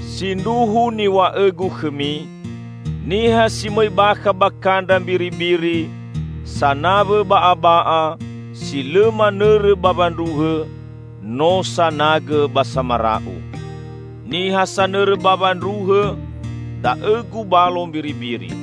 "Sindruhu niw̃a'õ-Gu khõmi: Niha si mõi bakha ba kandra mbiribiri, sanawõ ba'aba'a, si lõ manõrõ bawa ndruhõ, no sanagõ ba samara'u. Niha sanõrõ bawa ndruhõ, da'õ gubalo mbiribiri.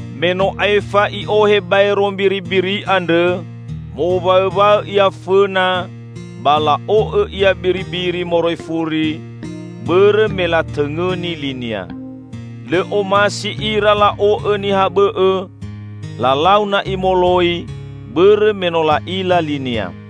Me no aefa i'ohe baero mbiribiri andrõ, mowaõwaõ ia fõna, ba la'o'õ ia biribiri moroi furi, bõrõ me latõngõni linia. Lõ omasi ira la'o'õ niha bõ'õ, lalau na'i moloi bõrõ me no la'ila linia."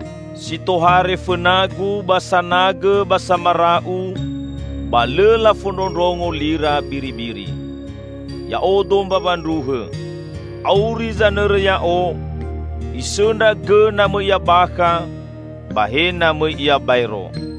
Si tohare fõna-Gu ba sanagõ ba samara'u, ba lõ lafondrondrongo lira biribiri. Ya'odo mbawa ndruhõ. Auri zanõrõ Ya'o; isõndra gõ na mõi ia bakha, ba he na mõi ia baero.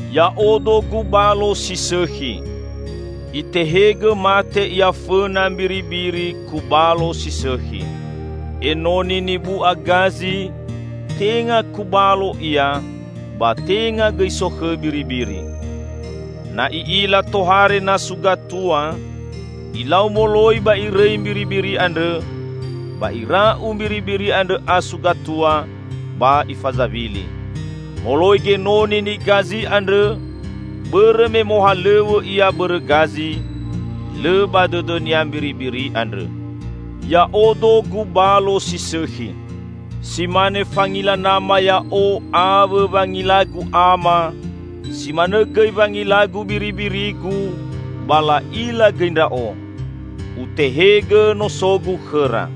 Ya'odo gubalo si sõkhi. Itehegõ mate ia fõna mbiribiri kubalo si sõkhi. Enoni nibu'a gazi, tenga kubalo ia, ba tenga gõi sokhõ biribiri. Na i'ila tohare nasu gatua, ilau moloi ba irõi mbiribiri andrõ, ba ira'u mbiribiri andrõ asu gatua ba ifazawili. Moloi genoni nigazi andrõ bõrõ me mohalõw̃õ ia bõrõ gazi; lõ ba dõdõnia mbiribiri andrõ. Ya'odo gubalo si sõkhi. Si mane fangila nama Ya'o awõ wangila-Gu Ama, si manõ gõi wangila-Gu biribiri-Gu ba la'ila gõi Ndra'o. Utehegõ noso-Gu khõra.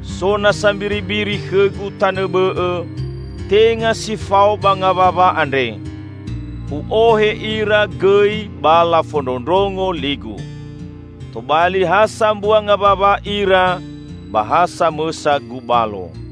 So nasa mbiribiri khõ-Gu tanõ bõ'õ, tenga si fao ba ngawawa andre. U'ohe ira gõi ba lafondrondrongo li-Gu. Tobali ha sambua ngawawa ira ba ha samõsa gubalo.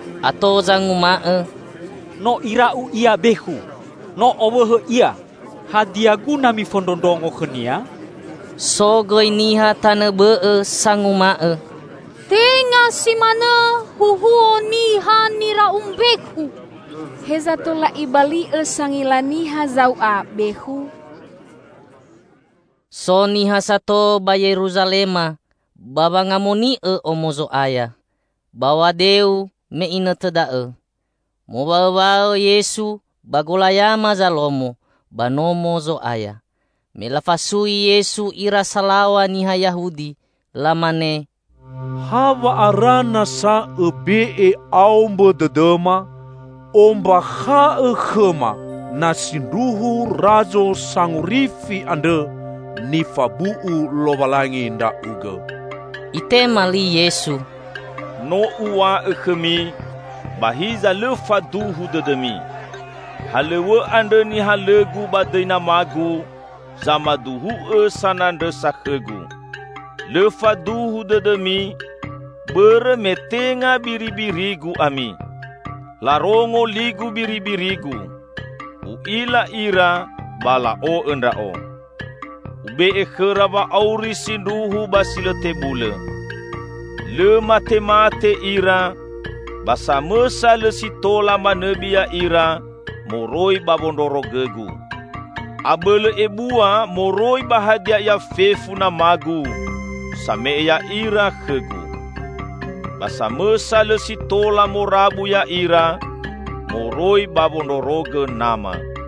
Ato zanguma'õ, "No ira'u Ia bekhu! No owõhõ Ia! Hadia guna mifondrondrongo khõ-Nia?" So gõi niha tanõ bõ'õ sanguma'õ, "Tenga si manõ huhuo niha nira'u mbekhu! Heza tola ibali'õ sangila niha zau'a bekhu?" So niha sato ba Yeruzalema ba wangamoni'õ Omo Zo'aya. Baw̃a deu me inõtõ da'õ. Mowaõwaõ Yesu ba golayama Zalomo ba Nomo Zo'aya, me lafasui Yesu ira salaw̃a niha Yahudi, lamane, "Hawa'ara nasa Õbe'e aombõ dõdõma? Ombakha'õ khõma, na sindruhu Razo Sangorifi andrõ nifabu'u Lowalangi Ndra'ugõ." Itema li Yesu, "No Uw̃a'õ khõmi, ba hiza lõ faduhu dõdõmi. Halõw̃õ andrõ nihalõ-Gu ba dõi nama-Gu, zamaduhu'õ sanandrõsa khõ-Gu. Lõ faduhu dõdõmi bõrõ me tenga biribiri-Gu ami. Larongo li-Gu biribiri-Gu. U'ila ira, ba la'o'õ Ndra'o. Ube'e khõra wa'auri sindruhu ba si lõ tebulõ. Lõ matemate ira, ba samõsa lõ si tola manõbi ya'ira moroi ba wondrorogõ-Gu. Abõlõ ebua moroi ba hadia ia fefu nama-Gu, same'e ya'ira khõ-Gu. Ba samõsa lõ si tola morabu ya'ira moroi ba wondrorogõ Nama.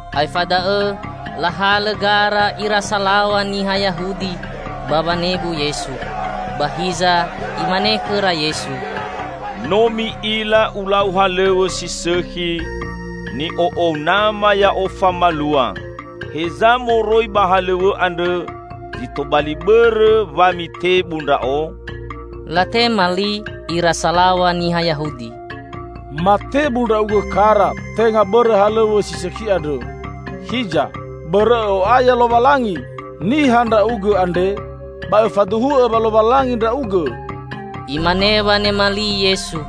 Aefa da'õ lahalõ gara ira salaw̃a niha Yahudi ba wanebu Yesu. Ba hiza Imane khõra Yesu, "No mi'ila Ulau halõw̃õ si sõkhi, ni'o'ou Nama Ya'o famalua; heza moroi ba halõw̃õ andrõ zi tobali bõrõ wa mitebu Ndra'o?" Latema li ira salaw̃a niha Yahudi, "Matebu Ndra'ugõ kara tenga bõrõ halõw̃õ si sõkhi andrõ, hiza bõrõ Õ'o'aya Lowalangi! Niha Ndra'ugõ andre ba Õfaduhu'õ wa Lowalangi Ndra'ugõ!" Imane wanema li Yesu,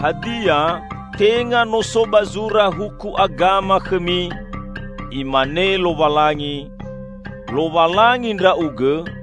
"Hadia, tenga no so ba zura huku agama khõmi: Imane Lowalangi, 'lowalangi ndra'ugõ'?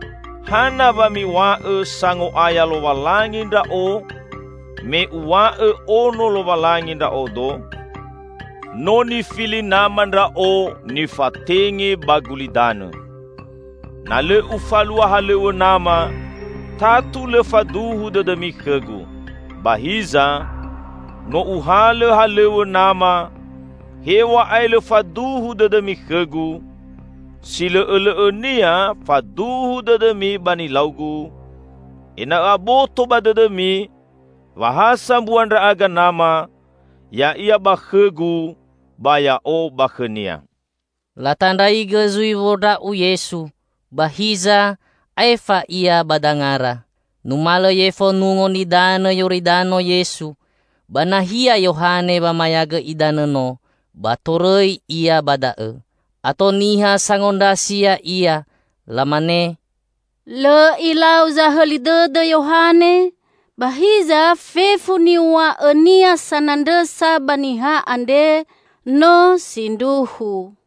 hana wa miw̃a'õ sango'aya Lowalangi Ndra'o me Uw̃a'õ ono Lowalangi Ndra'odo? No nifili Nama Ndra'o nifatenge ba gulidanõ. Na lõ Ufalua halõw̃õ Nama, tatu lõ faduhu dõdõmi khõ-Gu. Ba hiza, no Uhalõ halõw̃õ Nama, hew̃a'ae lõ faduhu dõdõmi khõ-Gu, si lõ'õ lõ'õnia faduhu dõdõmi ba nilau-Gu, ena'õ aboto ba dõdõmi wa ha sambua Ndra'aga Nama, Ya'ia ba khõ-Gu, ba Ya'o ba khõ-Nia." Latandraigõ zui wondra'u Yesu, ba hiza aefa Ia ba dangara. Numalõ yefo Nungo Nidanõ Yoridano Yesu, ba nahia Yohane wamayagõ idanõ no, ba torõi Ia ba da'õ. Ato niha sangondrasi Ya'ia. Lamane, "Lõ ilau zahõli dõdõ Yohane, ba hiza fefu niw̃a'õnia sanandrõsa ba Niha andre, no sindruhu."